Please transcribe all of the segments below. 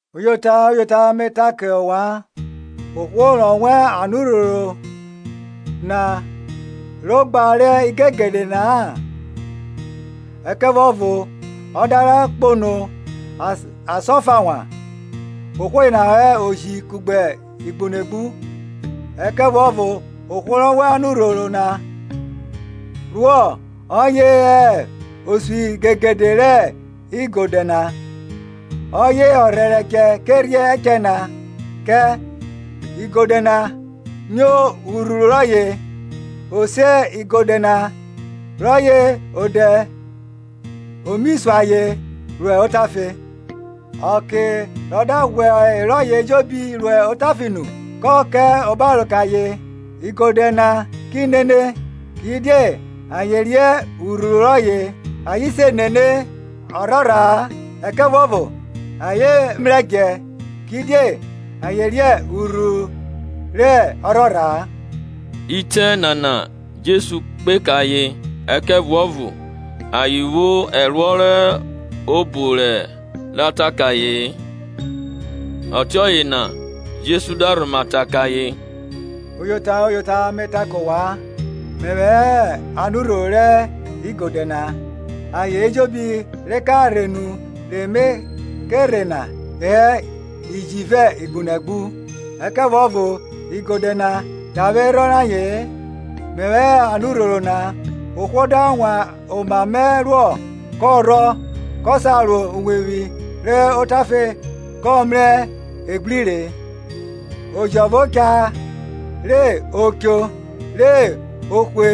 Uyota, uyota, me ta kẹ ovwan, ohwo rọ wan anurhoro na ro ogba rẹ igegede na-a ẹkẹvuọvo ọ da ra kpanọ asan ọfa wan, ohwo yena hẹ oji kugbe igbunegbu; ẹkẹvuọvo ohwo rọ wan anurhoro na ruọ ọye hẹ osuigegede rẹ igodẹ na. Ọye ọrhẹrẹchẹ che rhiẹ ẹchẹ kẹ; igodẹ na nyo urhuru rọye, o se igodẹ rọye odẹ o mi sun ayen ro otafe. Ọke rọ da ghwẹ erọye ejobi ro otafe nu, kọ ka obaro kẹ ayen, igodẹ na ki nene, kidie ayen riẹn urhuru rọye. Ayen se nene ọrhorha-a, ẹkẹvuọvo ayen mrẹ djẹ, kidie ayen riẹn urhuru rẹ erhorha-a. Itẹ nana Jesu kpe kẹ ayen, ẹkẹvuọvo ayen vwo ẹruọ rẹ obo rọ ta kẹ aye-en. Ọtiọye na Jesu da rhoma ta kẹ ayen, Uyota, uyota, me ta kẹ ovwan, Mẹvwẹ hẹ anurhoro rẹ igodẹ na. Ayen ejobi re ka rhe nu re me ke rhe na hẹ iji vẹ igbunegbu; ẹkẹvuọvo igodẹ na davwerhọn rẹ aye-en. Mẹvwẹ hẹ anurhoro na; ohwo da wan oma mẹ ruọ, kọ rhọ, kọ sa ro uwevwi ro otafe kọ mrẹ egbri re. Oji ọvo cha re o cho re o hwe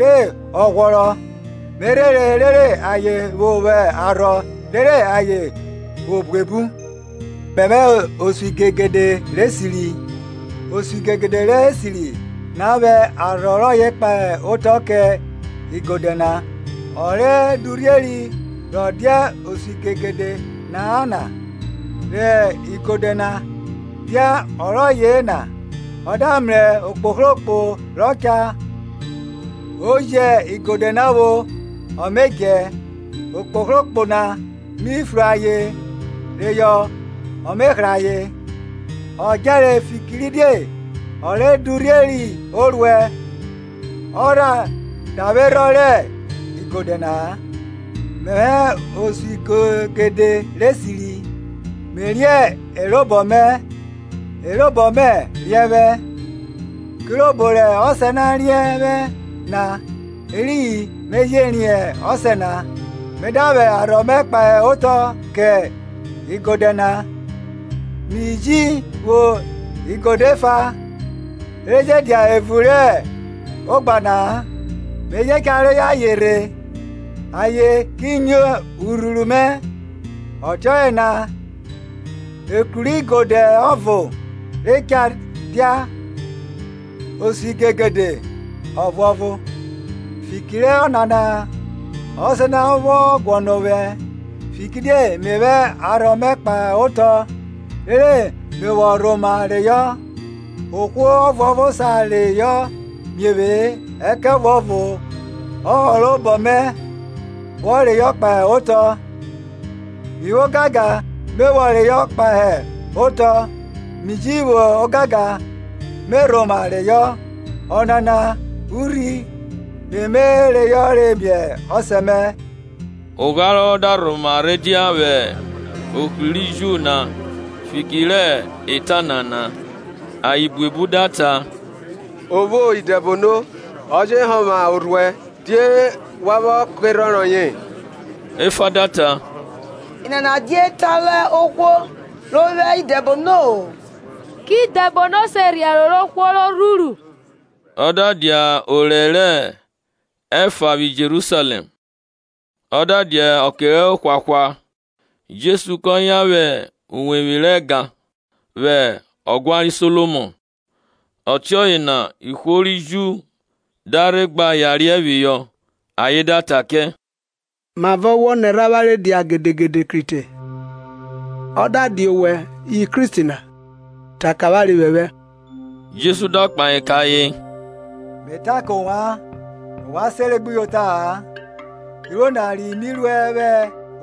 re ọ ghwọrọ; me rhere rere ayen vwo vwo arhọ, rere ayen vwo buebu. Mẹvwẹ hẹ osuigegede rẹ esiri. Osuigegede rẹ esiri na vwẹ arhọ rọye kpahe otọ kẹ igodẹ na. Ọ re durhieri rọ dia osuigegede na-a na, rẹ igodẹ na dia erọye-e na, ọ da mrẹ okpohrokpo rọ cha ọ me djẹ jẹ igodẹ na vwo; okpohrokpo na mi fru ayen reyọ ọ me hra ayen. Ọ djẹre fikiridie ọ re durhieri oruẹ ọ rha davwerhọn rẹ igodẹ na-a. Mẹvwẹ hẹ osuigegede rẹ esiri; me riẹn e robọ mẹ e robọ mẹ je riẹn vwẹ, kirobo rẹ Ọsẹ na riẹn vwẹ na eriyin me je riẹn Ọsẹ na; me da vwẹ arhọ mẹ kpahe otọ kẹ igodẹ na. Mi ji vwo igodẹ efa, re je dia evun rẹ ogba na-a; me je cha reyọ ayen rhe, ayen ki nyo urhuru mẹ. Ọtiọye na ekru rẹ igodẹ ọvo re cha dia, osuigegede ọvuọvo. Fiki rẹ ọnana Ọsẹ na vwọ guọnọ ovwẹ, fikiridie me vwẹ arhọ mẹ kpahe otọ, rere me vwọ rhoma reyọ. Ohwo ọvuọvo sa reyọ mie vwe-e, ẹkẹvuọvo ọhorobọ mẹ me vwọ reyọ kpahe otọ. Mi vwo ogangan me vwọ reyọ kpahe otọ, mi ji vwo ogangan me rhoma reyọ; ọnana urhi re me reyọ miẹ Ọsẹ mẹ. Ogharọ da rhoma rhe dia vwẹ ohri ri Ju na fiki rẹ eta nana. Ayen buebu da ta, O vwo idẹbono, ọ je honvwa orhuẹ; die wa vwọ kerhọn rọye? Efa da ta, Enana dia eta rẹ ohwo ro vwo idẹbono-o Kẹ idẹbono se rhiẹ ẹro rẹ ohwo ro rhuru? Ọ da dia okẹ rẹ orẹ rẹ orufuọn vwi Jerusalẹm; ọ da dia ọke ohwahwa, Jesu kọ yan vwẹ uwevwi rẹ ẹga na, vwẹ ọguan ri Solomọn. Ọtiọye na ihwo ri Ju da rhe gba yariẹ phihọ ayen da ta kẹ, Mavọ wọ nẹrhẹ avwanre dia gedegede krite? Ọ da dia owẹ hẹ Kristi na ta kẹ avwanre phephẹ. Jesu da kpahe kẹ ayen, Me ta kẹ ovwan, ovwan sere gbuyota-a. Iruo na ri mi ruẹ vwẹ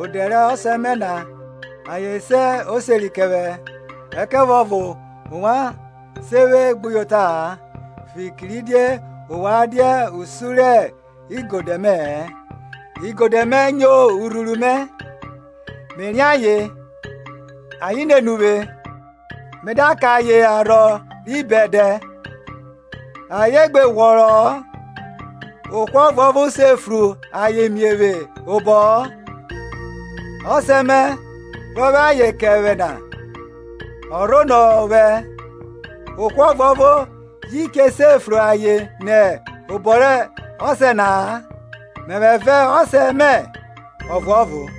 odẹ rẹ Ọsẹ mẹ na, ayen se oseri kẹ vwẹ; ẹkẹvuọvo ovwan se vwẹ gbuyota-a, fikiridie ovwan dia usun rẹ igodẹ mẹ-ẹ. Igodẹ mẹ nyo urhuru mẹ, me riẹn ayen, ayen nene uvwe; me da kẹ ayen arhọ ri bẹdẹ, ayen gbe ghwọrọ-ọ, ohwo ọvuọvo se fru ayen nẹ obọ mẹ-ẹ. Ọsẹ mẹ, rọ vwẹ ayen kẹ vwẹ na, ọ rhonọ ovwẹ, ohwo ọvuọvo ji che se fru ayen nẹ obọ rẹ Ọsẹ na-a. Mẹvwẹ vẹ Ọsẹ mẹ ọvuọvo.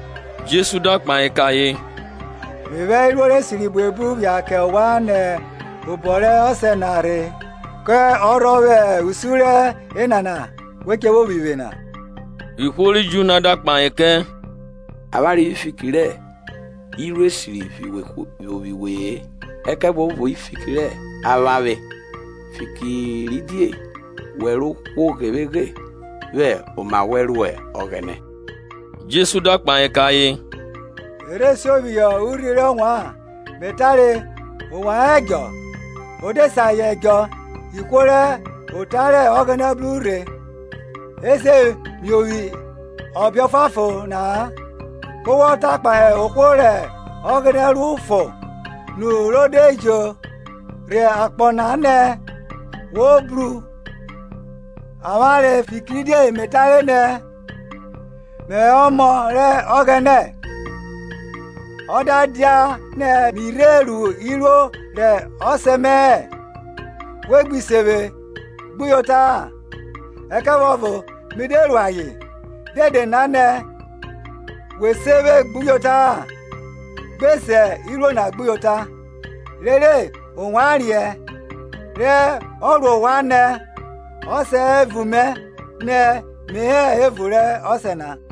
Jesu da kpahe kẹ ayen, Me vwẹ iruo rẹ esiri buebu phia kẹ ovwan nẹ obọ rẹ Ọsẹ na rhe; kẹ ọrhọ vwẹ usun rẹ enana we che vwo phi vwe na? Ihwo ri Ju na da kpahe kẹ, Avwanre vwi fiki rẹ iruo esiri phi wee; ẹkẹvuọvo fiki rẹ avwavwe; fikiridie wẹ, rẹ ohwo ghevweghe, vwẹ oma wẹn ruẹ Ọghẹnẹ Jesu da kpahe kẹ ayen, E rhe sio phihọ urhi rẹ ovwan, me tare, ovwan hẹ edjọ? Ọ de se ayen edjọ ihwo rẹ ota rẹ Ọghẹnẹ bru rhe je se miovwi ọbe ọfuanfon na-a. Ku wọ ta kpahe ohwo rẹ Ọghẹnẹ ru fon nu ro de jo rhe akpọ na nẹ, Wo bru avwavwe, fikiridie me tare nẹ, Mẹvwẹ Ọmọ rẹ Ọghẹnẹ? Ọ da dianẹ mi rhe ru iruo rẹ Ọsẹ mẹ-ẹ, we gbi se vwe gbuyota-a; ẹkẹvuọvo mi de ru ayen, dede na nẹ we se vwe gbuyota-a, gbe se iruo na gbuyota, rere ovwan riẹn re ọ ro ovwan nẹ Ọsẹ hẹ evun mẹ nẹ mi he evun rẹ Ọsẹ na.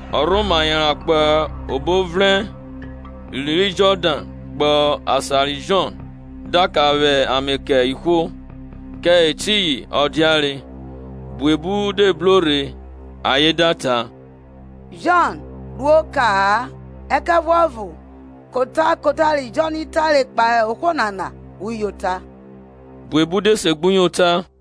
Ọ rhoma yanran kpo obo ovrẹn ri Jọdan kpo asan ri Jọn da ka vwẹ ame kẹ ihwo, kẹ etiyin ọ diare. Buebu de bro rhe; ayen da ta, Jọn ru oka-a, ẹkẹvuọvo kota kota ri Jọn tare kpahe ohwo nana uyota. Buebu de segbuyota.